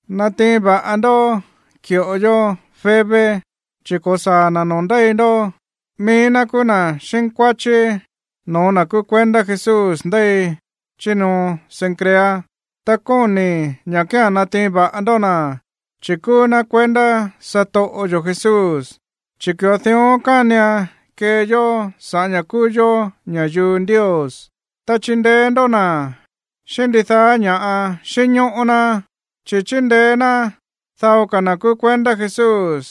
Natiin va̱ꞌa ndó ki̱ꞌo yó Febe, chi̱ ko̱saa̱ na̱ noo̱ ndéi ndó. Mií ná kúú na̱ xínkuáchí no̱ó na̱ kúú kuendá Jesús ndéi chí ñoo Cencrea. Ta kóni̱i̱ ña̱ kía̱n natiin va̱ꞌa ndó na̱, chi̱ kúú ná kuendá satoꞌo yo̱ Jesús, chi̱ ki̱ꞌo dión kánian kee yó sa̱ꞌá ña̱ kúú yó ña̱yuu Ndios. Ta chindeé ndó na̱ xíꞌín ndidaá ña̱ꞌa xínñóꞌó ná, chi̱ chíndeé ná dao ka̱ na̱ kúú kuendá Jesús,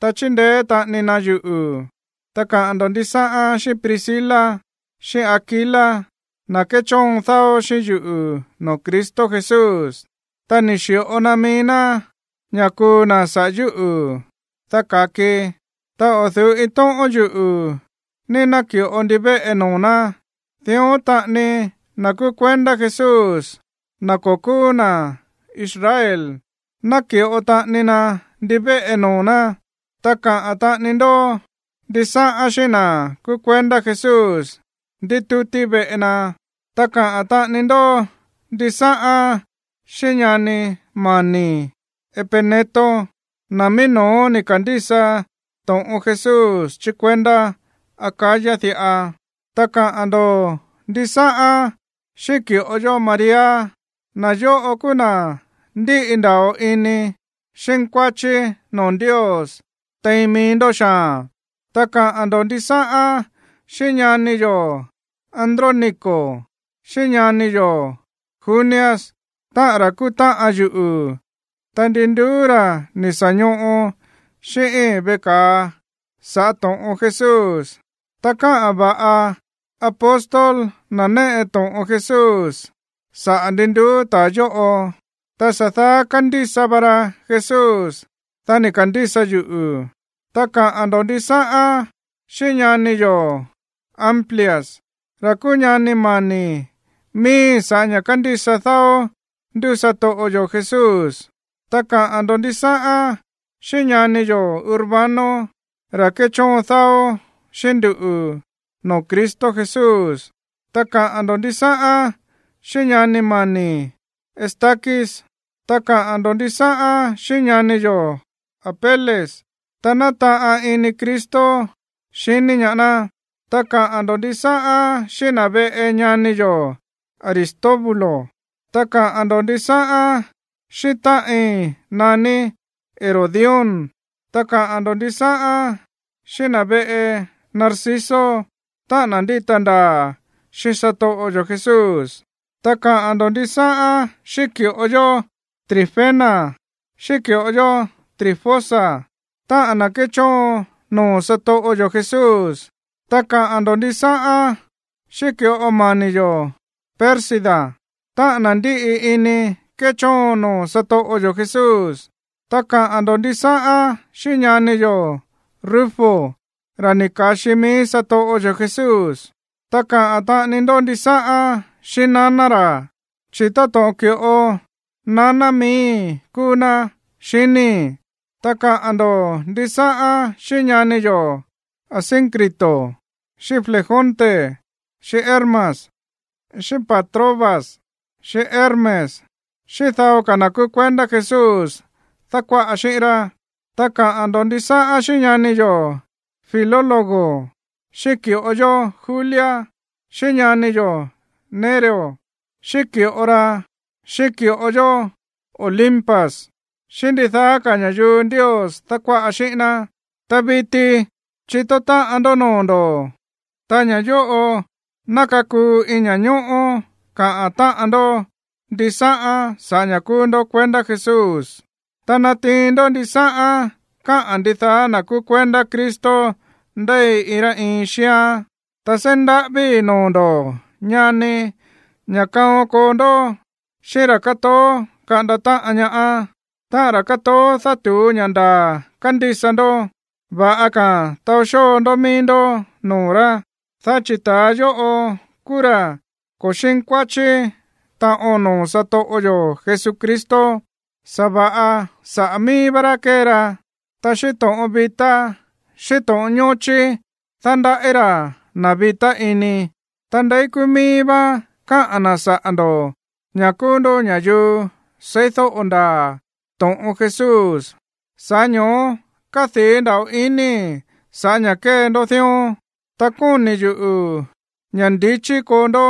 ta chíndeé taꞌani na yuꞌu̱. Ta kaꞌa̱n ndo̱ ndisáꞌán xíꞌín Priscila, xíꞌín Aquila, na̱ kéchóon dáó xíꞌín yuꞌu̱ noo̱ Cristo Jesús. Ta ni̱ xi̱ꞌo na mií ná ña̱ kuu na̱ saꞌa̱ yúꞌu̱, dá ka̱kii. Ta o̱ du̱ú iin tóꞌón yuꞌu̱ ní náki̱ꞌo ndivéꞌe noo̱ ná, dión taꞌani na̱ kúú kuendá Jesús, na̱ ko̱ kúú na̱ Israel, náki̱ꞌo taꞌani na ndivéꞌe noo̱ ná. Ta kaꞌa̱n taꞌani ndó ndisáꞌán xíꞌín na̱ kúú kuendá Jesús ndítútí veꞌe na. Ta kaꞌa̱n taꞌani ndó ndisáꞌán xíꞌín ñani mani̱i̱ Epeneto, na̱ mií no̱ó ni̱ ka̱ndísa to̱ꞌon Jesús chí kuendá Acaya diꞌa. Ta kaꞌa̱n ndo̱ ndisáꞌán xíꞌín ki̱ꞌo yó María. Na̱ yóꞌo kúú na̱ ndíꞌi nda̱ꞌo ini xínkuáchí noo̱ Ndios tein mií ndó xaa̱n. Ta kaꞌa̱n ndo̱ ndisáꞌán xíꞌín ñani yo̱ Andrónico xíꞌín ñani yo̱ Junias, táꞌa̱n ra̱ kúú táꞌan yuꞌu̱, ta ndi nduú ra̱ ni̱ sa̱ ñoꞌo xíꞌíín veꞌe ka̱a sa̱ꞌá to̱ꞌon Jesús. Ta káꞌa̱n va̱ꞌa apóstol, na̱ néꞌe to̱ꞌon Jesús, saꞌa̱ ndi nduú ta̱a yóꞌo. Ta sa̱ daá kándísa va ra Jesús, dá ni̱ ka̱ndísa yuꞌu̱. Ta kaꞌa̱n ndo̱ ndisáꞌán xíꞌín ñani yo̱ Amplias, ra̱ kúú ñani mani̱ miíí sa̱ꞌá ña̱ kándísa dáó ndú satoꞌo yo̱ Jesús. Ta kaꞌa̱n ndo̱ ndisáꞌán xíꞌín ñani yo̱ Urbano, ra̱ kéchóon dáó xíꞌín nduꞌu̱ noo̱ Cristo Jesús. Ta kaꞌa̱n ndo̱ ndisáꞌán xíꞌín ñani mani̱i̱ Estaquis. Ta kaꞌa̱n ndo̱ ndisáꞌán xíꞌín ñani yo̱ Apeles, ta nátaꞌan ini Cristo xiní ñaá ná. Ta kaꞌa̱n ndo̱ ndisáꞌán xíꞌín na̱ veꞌe ñani yo̱ Aristóbulo. Ta kaꞌa̱n ndo̱ ndisáꞌán xíꞌín táꞌin naní Herodión. Ta kaꞌa̱n ndo̱ ndisáꞌán xíꞌín na̱ veꞌe Narciso, táꞌa̱n na̱ ndíta ndaa̱ xíꞌín satoꞌo yo̱ Jesús. Ta kaꞌa̱n ndo̱ ndisáꞌán xíꞌín ki̱ꞌo yó Trifena xíꞌín ki̱ꞌo yó Trifosa, táꞌa̱n na̱ kéchóon noo̱ satoꞌo yo̱ Jesús. Ta kaꞌa̱n ndo̱ ndisáꞌán xíꞌín ki̱ꞌo mani̱ yo̱ Pérsida, táꞌa̱n na̱ ndíꞌi ini kéchóon noo̱ satoꞌo yo̱ Jesús. Ta kaꞌa̱n ndo̱ ndisáꞌán xíꞌín ñani yo̱ Rufo, ra̱ ni̱ ka̱xi mií satoꞌo yo̱ Jesús. Ta kaꞌa̱n taꞌani ndó ndisáꞌán xíꞌín naná ra̱, chi̱ táto̱ꞌon ki̱ꞌo naná miíi̱ kúú ná, xiníi̱. Ta kaꞌa̱n ndo̱ ndisáꞌán xíꞌín ñani yo̱ Asíncrito, xíꞌín Flegonte, xíꞌín Hermas, xíꞌín Patrobas, xíꞌín Hermes xíꞌín dao ka̱ na̱ kúú kuendá Jesús dákuáꞌa xíꞌín rá. Ta kaꞌa̱n ndo̱ ndisáꞌán xíꞌín ñani yo̱ Filólogo, xíꞌín ki̱ꞌo yó Julia, xíꞌín ñani yo̱ Nereo, xíꞌín ki̱ꞌo ra, xíꞌín ki̱ꞌo yó Olimpas xíꞌín ndidaá ka̱ ña̱yuu Ndios dákuáꞌa xíꞌín ná. Ta viti chitó táꞌan ndó noo̱ ndo̱, ta ña̱ yóꞌo ná kakuu iin ña̱ñóꞌó kaꞌa̱n táꞌan ndó ndisáꞌán sa̱ꞌá ña̱ kúú ndó kuendá Jesús. Ta natiin ndó ndisáꞌán káꞌa̱n ndidaá na̱ kúú kuendá Cristo ndéi iin rá iin xíán. Ta seí ndaꞌávíi̱ noo̱ ndo̱, ñani, ña̱ kaon koo ndó xíꞌín ra̱ kátoó kaꞌanda táꞌan ñaá, táꞌa̱n ra̱ kátoó dátu̱ú ña̱ ndaa̱ kándísa ndó. Va̱ꞌa ka̱a̱n taó xóo ndó mií ndó noo̱ rá. Dá chi̱ ta̱a yóꞌo kúú ra̱ ko̱ xínkuáchí taꞌon noo̱ satoꞌo yo̱ Jesucristo, sa̱va̱ꞌa saꞌa̱ mií vá rá kée ra. Ta xíꞌín to̱ꞌon vitá xíꞌín to̱ꞌon ñóchí dándaꞌí ra̱ na̱ vitá ini. Ta ndéi kúú mií vá káꞌa̱n na̱ saꞌa̱ ndo̱ ña̱ kúú ndó ña̱yuu seídóꞌo ndaa̱ to̱ꞌon Jesús, sa̱ꞌá ño̱ó kádii̱ nda̱ꞌo inii̱ sa̱ꞌá ña̱ kée ndó dión. Ta kóni̱ yuꞌu̱ ña̱ ndichí koo ndó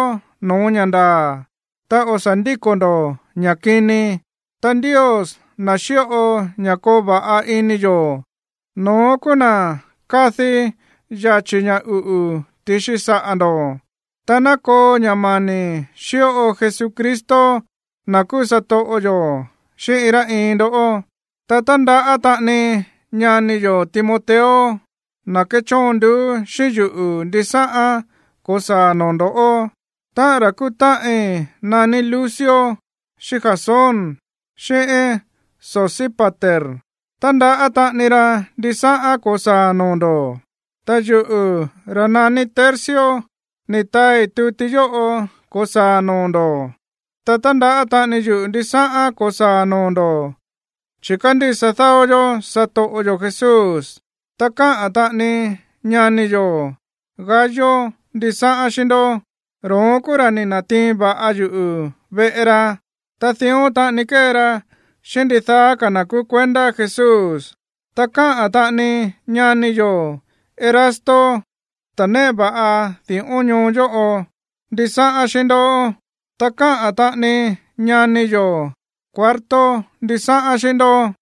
no̱ó ña̱ ndaa̱, ta o̱ sa̱ ndíko̱ ndo̱ ña̱ kini. Ta Ndios, na̱ xíꞌo ña̱ koo va̱ꞌa ini yo̱, no̱ón kúú na̱ kadi̱ yachi̱ ña̱ uꞌu̱ ti̱xi saꞌa̱ ndo̱. Ta ná koo ña̱ mani̱ xíꞌo Jesucristo, na̱ kúú satoꞌo yo̱, xíꞌín iin rá iin ndó. Ta tándaꞌá taꞌani ñani yo̱ Timoteo, ta̱ kéchóon nduú xíꞌín yuꞌu̱, ndisáꞌán ko̱saa̱ noo̱ ndo̱. Táꞌa̱n ra̱ kúú táꞌin naní Lucio, xíꞌín Jasón, xíꞌín Sosípater, tándaꞌá taꞌani ra ndisáꞌán ko̱saa̱ noo̱ ndo̱. Ta yuꞌu̱, ra̱ naní Tercio, ni̱ taai tuti yóꞌo ko̱saa̱ noo̱ ndo̱. Ta tándaꞌá taꞌani yuꞌu̱ ndisáꞌán ko̱saa̱ noo̱ ndo̱, chi̱ kándísa dáó yó satoꞌo yo̱ Jesús. Ta káꞌa̱n taꞌani ñani yo̱ Gayo ndisáꞌán xíꞌín ndó. Ro̱ón kúú ra̱ ni̱ na̱tiin va̱ꞌa yuꞌu̱ veꞌe ra, ta dión taꞌani kée ra xíꞌín ndidaá ka̱ na̱ kúú kuendá Jesús. Ta káꞌa̱n taꞌani ñani yo̱ Erasto, ta̱ néꞌe va̱ꞌa di̱ꞌón ñoo yóꞌo, ndisáꞌán xíꞌín ndó. Ta káꞌa̱n taꞌani ñani yo̱ Cuarto ndisáꞌán xíꞌín ndó.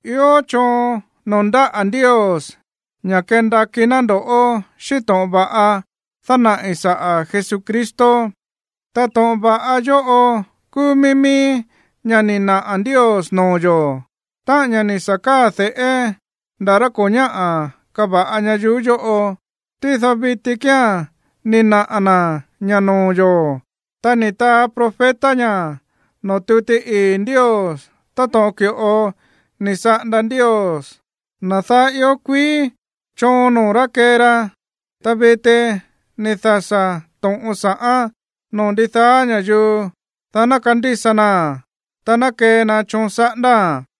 Ió choon noo̱ ndáꞌa̱ Ndios ña̱ kendakí ná ndo̱ꞌó xíꞌín to̱ꞌon va̱ꞌa dánaꞌi̱ saꞌa̱ Jesucristo. Ta to̱ꞌon va̱ꞌa yóꞌo kúú mií mií ña̱ ni̱ naꞌa̱ Ndios noo̱ yo̱, táꞌa̱n ña̱ ni̱ sa̱ káa̱ de̱ꞌé nda̱ rá ko̱ ñáꞌa̱ kava̱ꞌa ñayuú yóꞌo. Tído viti kía̱n ni̱ naꞌa̱ na̱ ñá noo̱ yo̱. Ta ni̱ taa profeta ña̱ noo̱ tuti ii̱ Ndios táto̱ꞌon ki̱ꞌo ni̱ saꞌanda Ndios, na̱ daá ió kuií, choon noo̱ ná kee na. Ta viti ni̱ dasa̱ to̱ꞌon sa̱ꞌán noo̱ ndidaá ña̱yuu, dá ná kandísa naa̱n, ta ná kee na choon saꞌándáa̱n.